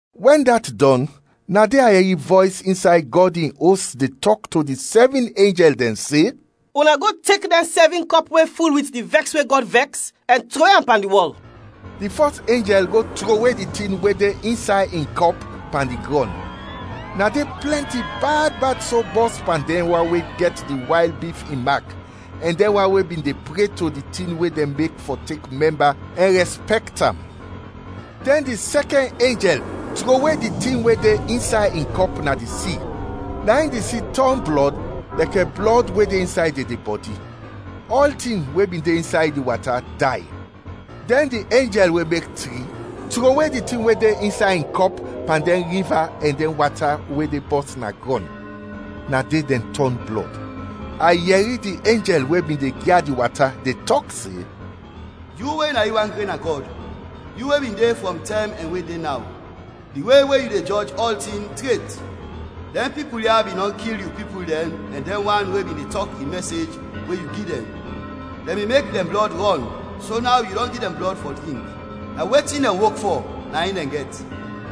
Wɛn dat dɔn, na de a yɛri vɔys insay Gɔd in Os de tɔk to di sɛvin enjɛl dɛn se, “Una go tek dɛn sɛvin kɔp we ful wit di vɛks we Gɔd vɛks, ɛn trowe am pan di wɔl!” Di fɔs enjɛl go trowe di tin we de insay in kɔp pan di grɔn, na de plɛnti bad bad so bɔs pan dɛn wan we gɛt di wayl bif in mak ɛn dɛn wan we bin de pre to di tin we dɛn mek fɔ tek mɛmba ɛn rɛspɛkt am. Dɛn di sɛkɛn enjɛl trowe di tin we de insay in kɔp na di si, na in di si tɔn blɔd lɛkɛ blɔd we de insay dedebɔdi; ɔltin we bin de insay di wata day. Dɛn di enjɛl we mek tri, trowe di tin we de insay in kɔp pan dɛn riva ɛn dɛn wata we de bɔs na grɔn, na de dɛn tɔn blɔd. A yɛri di enjɛl we bin de gyad di wata de tɔk se, “Yu we na yu wan gren na Gɔd, yu we bin de frɔm tɛm ɛn we de naw, di we we yu de jɔj ɔltin, tret! Dɛn pipul ya bin dɔn kil yu pipul dɛn ɛn dɛn wan we bin de tɔk di mɛsej we yu gi dɛn, dɛn bin mek dɛn blɔd rɔn so naw yu dɔn gi dɛn blɔd fɔ drink. Na wetin dɛn wok fɔ, na in dɛn gɛt!”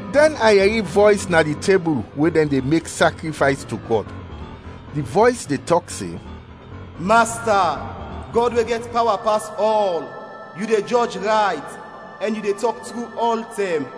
Dɛn a yɛri vɔys na di tebul we dɛn de mek sakrifays to Gɔd. Di vɔys de tɔk se, “Masta, Gɔd we gɛt pawa pas ɔl! Yu de jɔj rayt, ɛn yu de tɔk tru ɔltɛm!”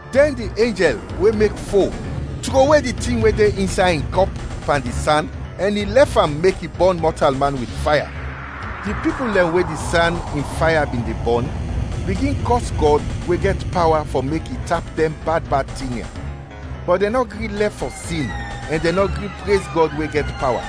Dɛn di enjɛl we mek fo trowe di tin we de insay in kɔp pan di san, ɛn i lɛf am mek i bɔn mɔtalman wit faya. Di pipul dɛn we di san in faya bin de bɔn, bigin kɔs Gɔd we gɛt pawa fɔ mek i tap dɛn bad bad tin ya. Bɔt dɛn nɔ gri lɛf fɔ sin ɛn dɛn nɔ gri prez Gɔd we gɛt pawa.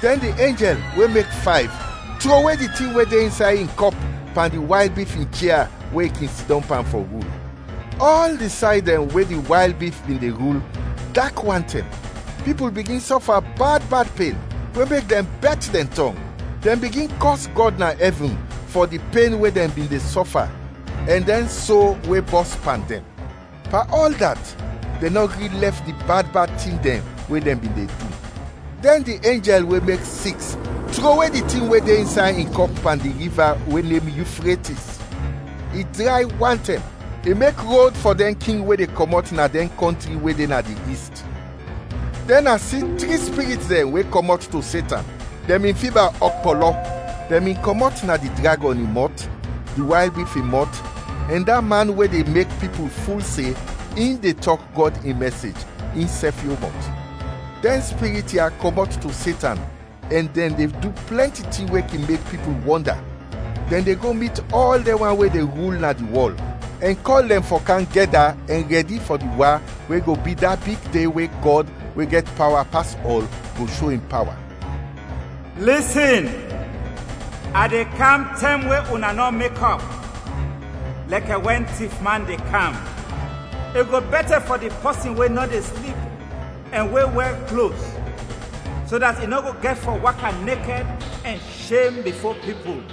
Dɛn di enjɛl we mek fayv trowe di tin we de insay in kɔp pan di wayl bif in chia we i kin sidɔm pan fɔ rul. Ɔl di say dɛn we di wayl bif bin de rul, dak wantɛm, pipul bigin sɔfa bad bad pen, we mek dɛn bɛt dɛn tɔng, dɛn bigin kɔs Gɔd na ɛvin fɔ di pen we dɛn bin de sɔfa ɛn dɛn so we bɔs pan dɛn. Pan ɔl dat, dɛn nɔ gri lɛf di bad bad tin dɛn we dɛn bin de du. Dɛn di enjɛl we mek siks trowe di tin we de insay in kɔp pan di riva we nem Yufretis. I dray wantɛm, i mek rod fɔ dɛn king we de kɔmɔt na dɛn kɔntri we de na di ist. Dɛn a si tri spirit dɛn we kɔmɔt to Setan, dɛn bin fiba ɔkpɔlɔ. Dɛn bin kɔmɔt na di dragɔn in mɔt, di wayl bif in mɔt, ɛn da man we de mek pipul ful se in de tɔk Gɔd in mɛsej, in sɛf yon mɔt. Dɛn spirit ya kɔmɔt to Setan ɛn dɛn de du plɛnti tin we kin mek pipul wɔnda. Dɛn de go mit ɔl dɛn wan we de rul na di wɔl, ɛn kɔl dɛn fɔ kam gɛda ɛn rɛdi fɔ di wa we go bi da big de we Gɔd, we gɛt pawa pas ɔl, go sho in pawa. “Lisin! A de kam tɛm we una nɔ mekɔp, lɛkɛ wɛn tifman de kam! I go bɛtɛ fɔ di pɔsin we nɔ de slip ɛn we wɛr klos, so dat i nɔ go gɛt fɔ waka nekɛd ɛn shem bifo pipul!”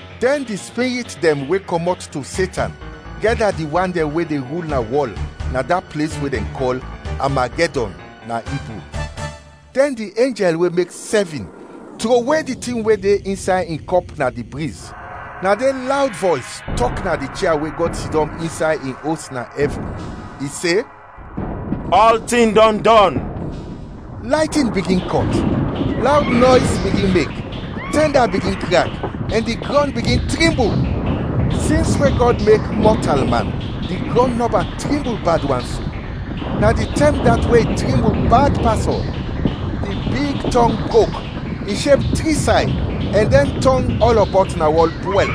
Dɛn di spirit dɛn we kɔmɔt to Setan gɛda di wan dɛn we de rul na wɔl na da ples we dɛn kɔl “Amagɛdɔn” na Ibru. Dɛn di enjɛl we mek sɛvin trowe di tin we de insay in kɔp na di briz, na de lawd vɔys tɔk na di chia we Gɔd sidɔm insay in Os na ɛvin, i se, “Ɔltin dɔn dɔn!” Laytin bigin kɔt, lawd nɔys bigin mek, tɛnda bigin krak, ɛn di grɔn bigin trimbul. Sins we Gɔd mek mɔtalman di grɔn nɔba trimbul bad wan so; na di tɛm dat we i trimbul bad pas ɔl! Di big tɔng brok, i sheb tri say, ɛn dɛn tɔng ɔlɔbɔt na wɔl pwɛl.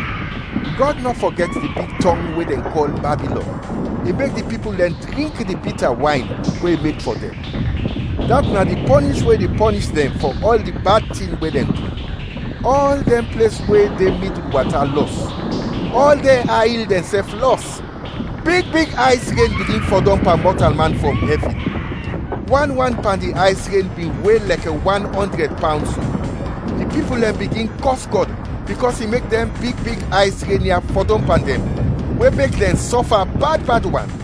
Gɔd nɔ fɔgɛt di big tɔng we dɛn kɔl Babilɔn, i mek di pipul dɛn drink di bita wayn we i mek fɔ dɛn, dat na di pɔnish we i de pɔnish dɛn fɔ ɔl di bad tin we dɛn du. Ɔl dɛn ples we de midul wata lɔs, ɔl dɛn ay il dɛnsɛf lɔs. Big big ays ren bigin fɔdɔm pan mɔtalman frɔm ɛvin. Wan wan pan di ays ren bin we lɛkɛ wan ɔndrɛd pawn so. Di pipul dɛn bigin kɔs Gɔd bikɔs i mek dɛn big big ays ren ya fɔdɔm pan dɛn, we mek dɛn sɔfa bad bad wan.